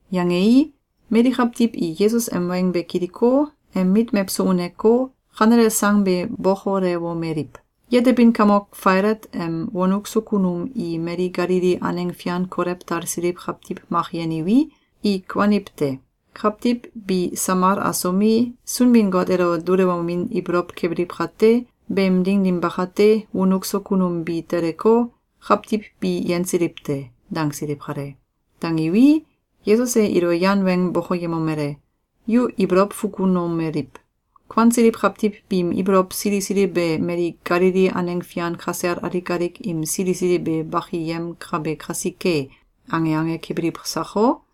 Yangei, mali kawtiw i Yesus em weng be kiliko, em mit mewso uneko, kanele sang be bokolewomeliw: “Yetebin kamok Failat em wonuk so kunum i mali Galili aneng fian kolew talsiliw kawtiw mak yeniwi, i kuaniw te. Kawtiw bi samal asomi, Sunbin-Got elo dulewomin ibolow kebiliw kate, beem ding dim bakate, wonuk so kunum bi teleko, kawtiw bi yensiliw te.”, dangsiliw kale. Dangiwi, Yesus e ilo yan weng bokoyemomele: “Yu ibolow fukunomeliw: ‘Kuansiliw kawtiw biim ibolow sili sili be mali Galili aneng fian kasel alik alik im sili sili be bakiyemkabe kasike!’, ange ange kebiliw sako?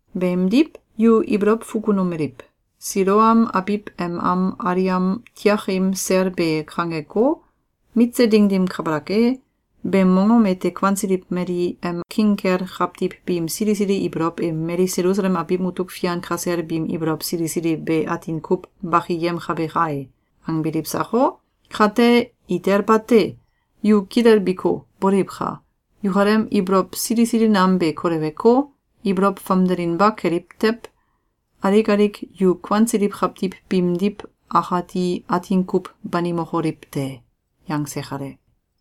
Beemdiw, yu ibolow fukunomeliw: ‘Siloam abiw em am aliam tiakim sel be kangeko, mitse ding dim kabalak e, beem mongom ete kuansiliw mali em king kel kawtiw biim sili sili ibolow e mali Selusalem abiw mutuk fian kasel biim ibolow sili sili be atin kuw bakiyemkabe kai!’, angbiliw sako? Kate, itel bate! Yu kilelbiko, boliwka! Yukalem ibolow sili sili nam be koleweko, ibolow famdelinba keliw tew, alik alik yu kuansiliw kawtiw biimdiw akati atin kuw banimokoliw te.”, yangse kale.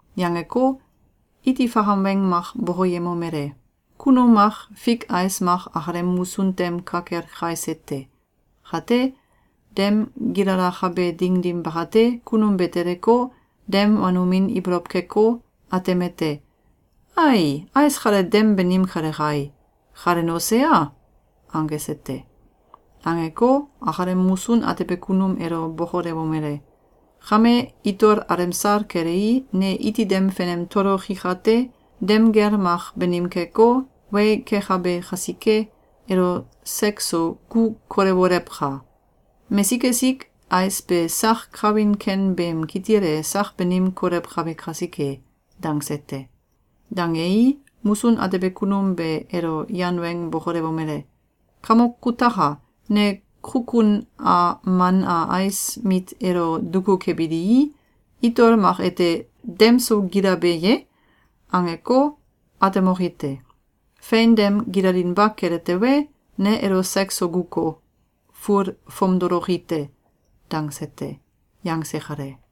Yangeko, iti fakam weng mak bokoyemomele: “Kunum mak fik ais mak akalem musun tem ka kel kaise te. Kate, dem gilalakabe ding dim bakate, kunum be teleko, dem wanomin ibolow keko, atemete: ‘Ai, ais kale dem banim kele kai! Kale nose a?’, angese te. Angeko, akalem musun atebe kunum elo bokolewomele: ‘Kame, itol alemsal kelei, ne iti dem fenem toloki kate, dem gel mak banim keko, wei kekabe kasike, elo sek so gu kolewolewka! Mesik esik ais be sak kawin ken beem kitil e sak banim kolewkabe kasike!’, dangse te. Dangei, musun atebe kunum be elo yan weng bokolewomele: ‘Kamok kutaka! Ne kukun a man a ais mit elo duku kebilii, itol mak ete ‘Dem so gilabe ye?’, angeko, atemoki te. Fein dem gilalinba kele tewe, ne elo sek so guko, ful fomdoloki te!’, dangse te.”, yangse kale.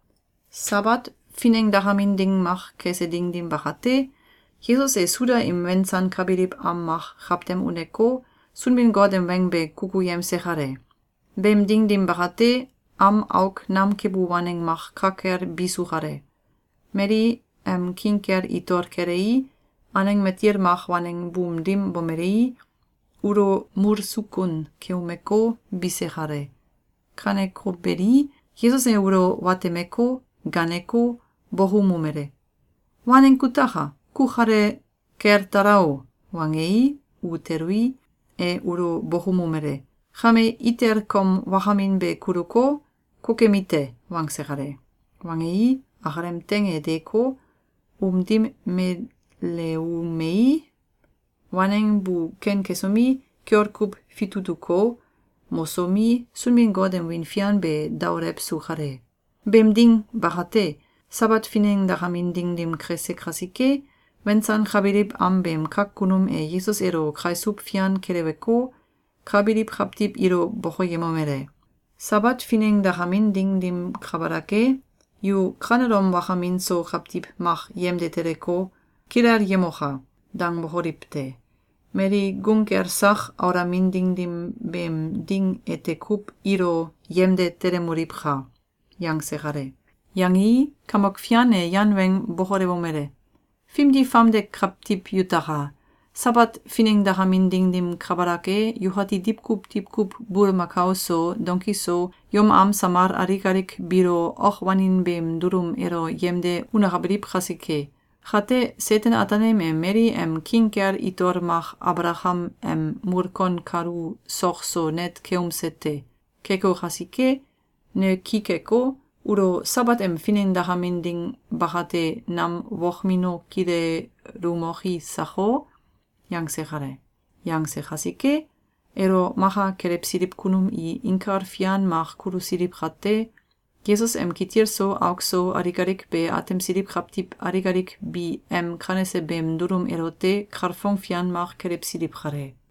Sabat finengdakamin ding mak kese ding dim bakate, Yesus e Suda im wensankabiliw am mak kawtem uneko, Sunbin-Got em weng be kukuyemse kale. Beem ding dim bakate, am auk nam kebu waneng mak ka kel bisu kale. Mali em king kel itol kelei, aneng matil mak waneng buum dim bomelei, ulo mulsukun keumeko, bise kale. Kaneko beli, Yesus e ulo watemeko, gaaneko, bokoumomele: “Waneng kutaka! Ku kale kel tala o!”, wangei, u telui, e ulo bokoumomele: “Kame itel kom wakamin be kuluko, kokemi te!”, wangse kale. Wangei, akalem teing e deeko, um dim meleumei, waneng bu ken kesomi, kiol kuw fitutuko, mosomi, Sunbin-Got em wiin fian be daolewsu kale. Beem ding bakate, Sabat finengdakamin ding dim kese kasike, wensankabiliw am beem kak kunum e Yesus elo kaisuw fian keleweko, ka biliw kawtiw ilo bokoyemomele: “Sabat finengdakamin ding dim kabalak e, yu kanelom wakamin so kawtiw mak yemde teleko, ‘Kilelyemoka!’, dangbokoliw te! Mali gung kel sak aulamin ding dim beem ding ete kuw ilo yemde telemoliwka!”, yangse kale. Yangei, Kamok Fian e yan weng bokolewomele: “Fimdi famde kawtiw yutaka! Sabat finengdakamin ding dim kabalak e, yukati diwkuw diwkuw bulmakao so, donki so, yom am samal alik alik biilo ok wanin beem dulum elo yemde unakabiliw kasike! Kate Seten-Ataanim e mali em king kel itol mak Abalakam em mulkon kalu sok so net keumse te. Keko kasike, ne ki keko, ulo Sabat em finengdakamin ding bakate nam wokmino kilelumoki sako?”, yangse kale. Yangse kasike, elo maka kelewsiliw kunum i inkal fian mak kulusiliw kate, Yesus em kitil so auk so alik alik be atemsiliw kawtiw alik alik bi em kanese beem dulum elote kalfong fian mak kelewsiliw kale.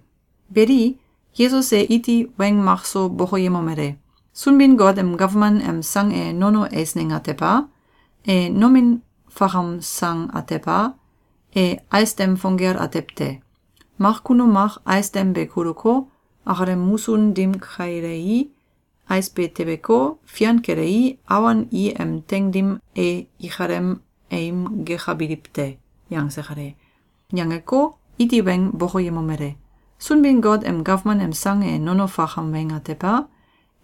Beli, Yesus e iti weng makso bokoyemomele: “Sunbin-Got em gawman em sang e nono eisneng atew a? E nomin fakam sang atew a? E ais dem fong gel atew te. Mak kunum mak ais dem be kuluko, akalem musun dim kailei, ais be tebeko, fian kelei, awon i em teing dim e ikalem aim gekabiliw te.”, yangse kale. Yangeko, iti weng bokoyemomele: “Sunbin-Got em gawman em sang e nono fakam weng atew a?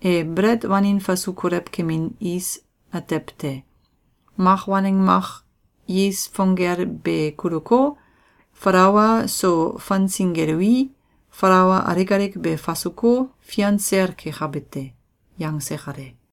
E belet wanin fasu kolew kemin is atew te. Mak waneng mak is fong gel be kuluko, falaua so fangsingelui, falaua alik alik be fasuko, fian sel kekabe te.”, yangse kale.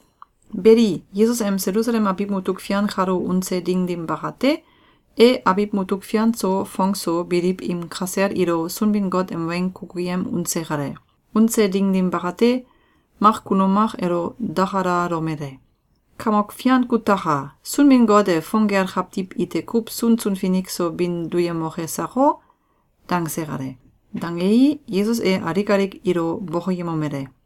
Beli, Yesus em Selusalem abiw mutuk fian kalo unse ding dim bakate, e abiw mutuk fian so fong so biliw im kasel ilo Sunbin-Got em weng kukuyem unse kale. Unse ding dim bakate, mak kunum mak elo dakalalomele: “Kamok Fian kutaka! Sunbin-Got e fong gel kawtiw ite kuw sunsun finik so bin duyemoke sako?”, dangse kale. Dangei, Yesus e alik alik ilo bokoyemomele: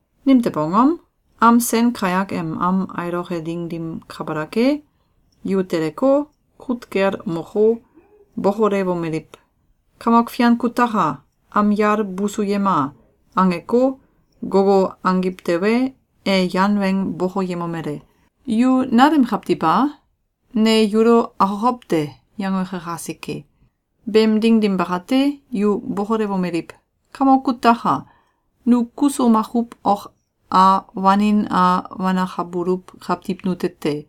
Nimtew angom? Am sen kayak em am ailoke ding dim kabalak e, yu teleko, kut kel moko, bokolewomeliw, ‘Kamok Fian kutaka! Am yal busuyema!’, angeko, gogo angiw tewe, e yan weng bokoyemomele: ‘Yu nalem kawtiw a? Ne yulo akokow te!’, yangoke kasike. Beem ding dim bakate, yu bokolewomeliw: ‘Kamok kutaka! Nu kuso makuw ok a wanin a wanakabuluw kawtiw nute te.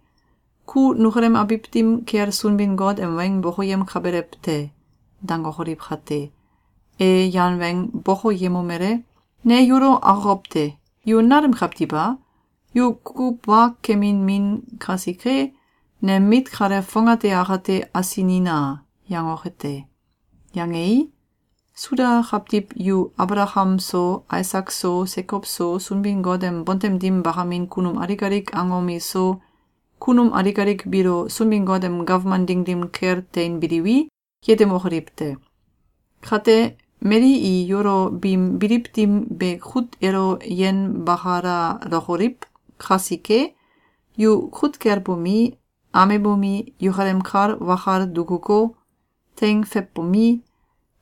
Ku nukalem abiw dim kel Sunbin-Got em weng bokoyemkabelew te.’, dangokoliw kate, e yan weng bokoyemomele: ‘Ne yulo akokow te! Yu nalem kawtiw a? Yu kukuw wa kemin min kasike, nem mit kale fongate akate asinina!’, yangoke te. Yangei, Suda kawtiw yu Abalakam so, Aisak so, Sekow so, Sunbin-Got em bontem dim bakamin kunum alik alik angom iso, kunum alik alik biilo Sunbin-Got em gawman ding dim kel teinbiliwi, yetemokoliw te. Kate, mali i yulo biim biliw dim be kut elo yenbakalalokoliw kasike, yu kut kel bomi, amebomi, yukalem kal wakal dukuko, teing feiwbomi,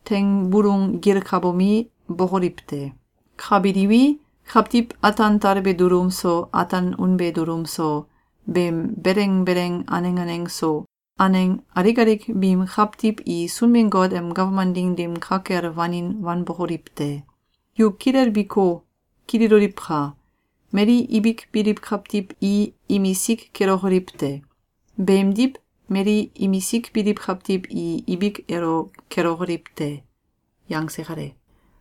teing bulung gilkabomi, bokoliw te. Ka biliwi, kawtiw ataan talbe dulum so, ataan unbe dulum so, beem beleng beleng aneng aneng so, aneng alik alik biim kawtiw i Sunbin-Got em gawman ding dim ka kel wanin wanbokoliw te. Yu kilelbiko, kililoliwka! Mali ibik biliw kawtiw i imisik kelokoliw te! Beemdiw, mali imisik biliw kawtiw i ibik elo kelokoliw te.”, yangse kale.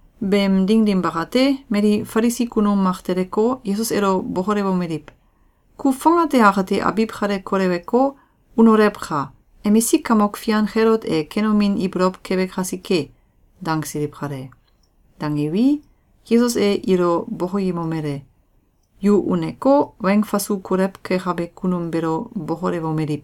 Beem ding dim bakate, mali Falisi kunum mak teleko, Yesus elo bokolewomeliw: “Ku fongate akate abiw kale koleweko, unolewka! Emisik kamok fian Kelot e kenomin ibolow kebe kasike.”, dangsiliw kale. Dangiwi, Yesus e ilo bokoyemomele: “Yu uneko, weng fasu kolew kekabe kunum beelo bokolewomeliw: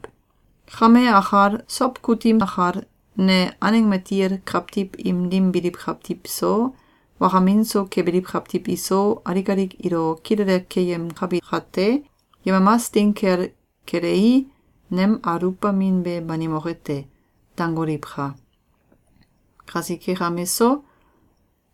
‘Kame akal, sow kutim akal, ne aneng matil kawtiw im dim biliw kawtiw so, wakamin so kebiliw kawtiw iso, alik alik ilo kilele keyemkabi kate, yemamas ding kel kelei, nem aluwbamin be banimoke te.’, dangoliwka! Kasike kame so,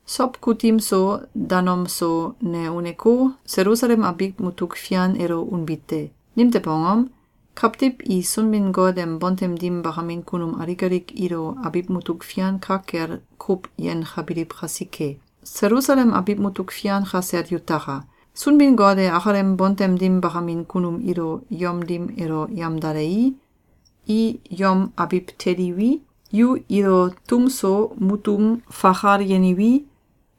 sow kutim so, danom so, ne uneko, Selusalem abiw mutuk fian elo unbi te. Nimtew angom? Kawtiw i Sunbin-Got em bontem dim bakamin kunum alik alik ilo abiw mutuk fian ka kel kuw yenkabiliw kasike. Selusalem abiw mutuk fian kasel yutaka! Sunbin-Got e akalem bontem dim bakamin kunum ilo yom dim elo yamdalei, i yom abiw teliwi, yu ilo tum so mutum fakal yeniwi,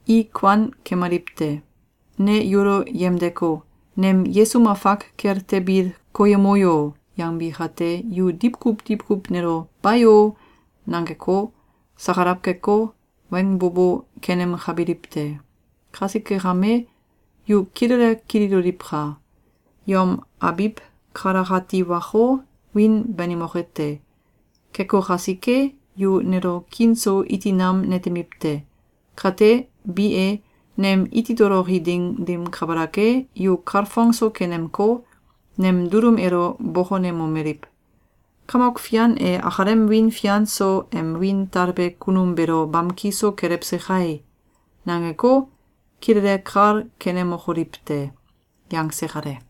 i kuan kemaliw te. Ne yulo yemdeko, ‘Nem yesum afak kel tebil koyemo yo!’, yangbi kate, yu diwkuw diwkuw nelo ‘Bayo!’, nangeko, sakalaw keko, weng bo bo kenemkabiliw te. Kasike kame, yu kilele kililoliwka! Yom abiw kalakati wako, wiin banimoke te. Keko kasike, yu nelo kiin so iti nam netemiw te. Kate, bi e, nem iti toloki ding dim kabalak e, yu kalfongso kenemko, nem dulum elo bokonemomeliw: ‘Kamok Fian e akalem wiin fian so em wiin talbe kunum beelo bamki so kelewse kai!’, nangeko, kilele kal kenemokoliw te.” yangse kale.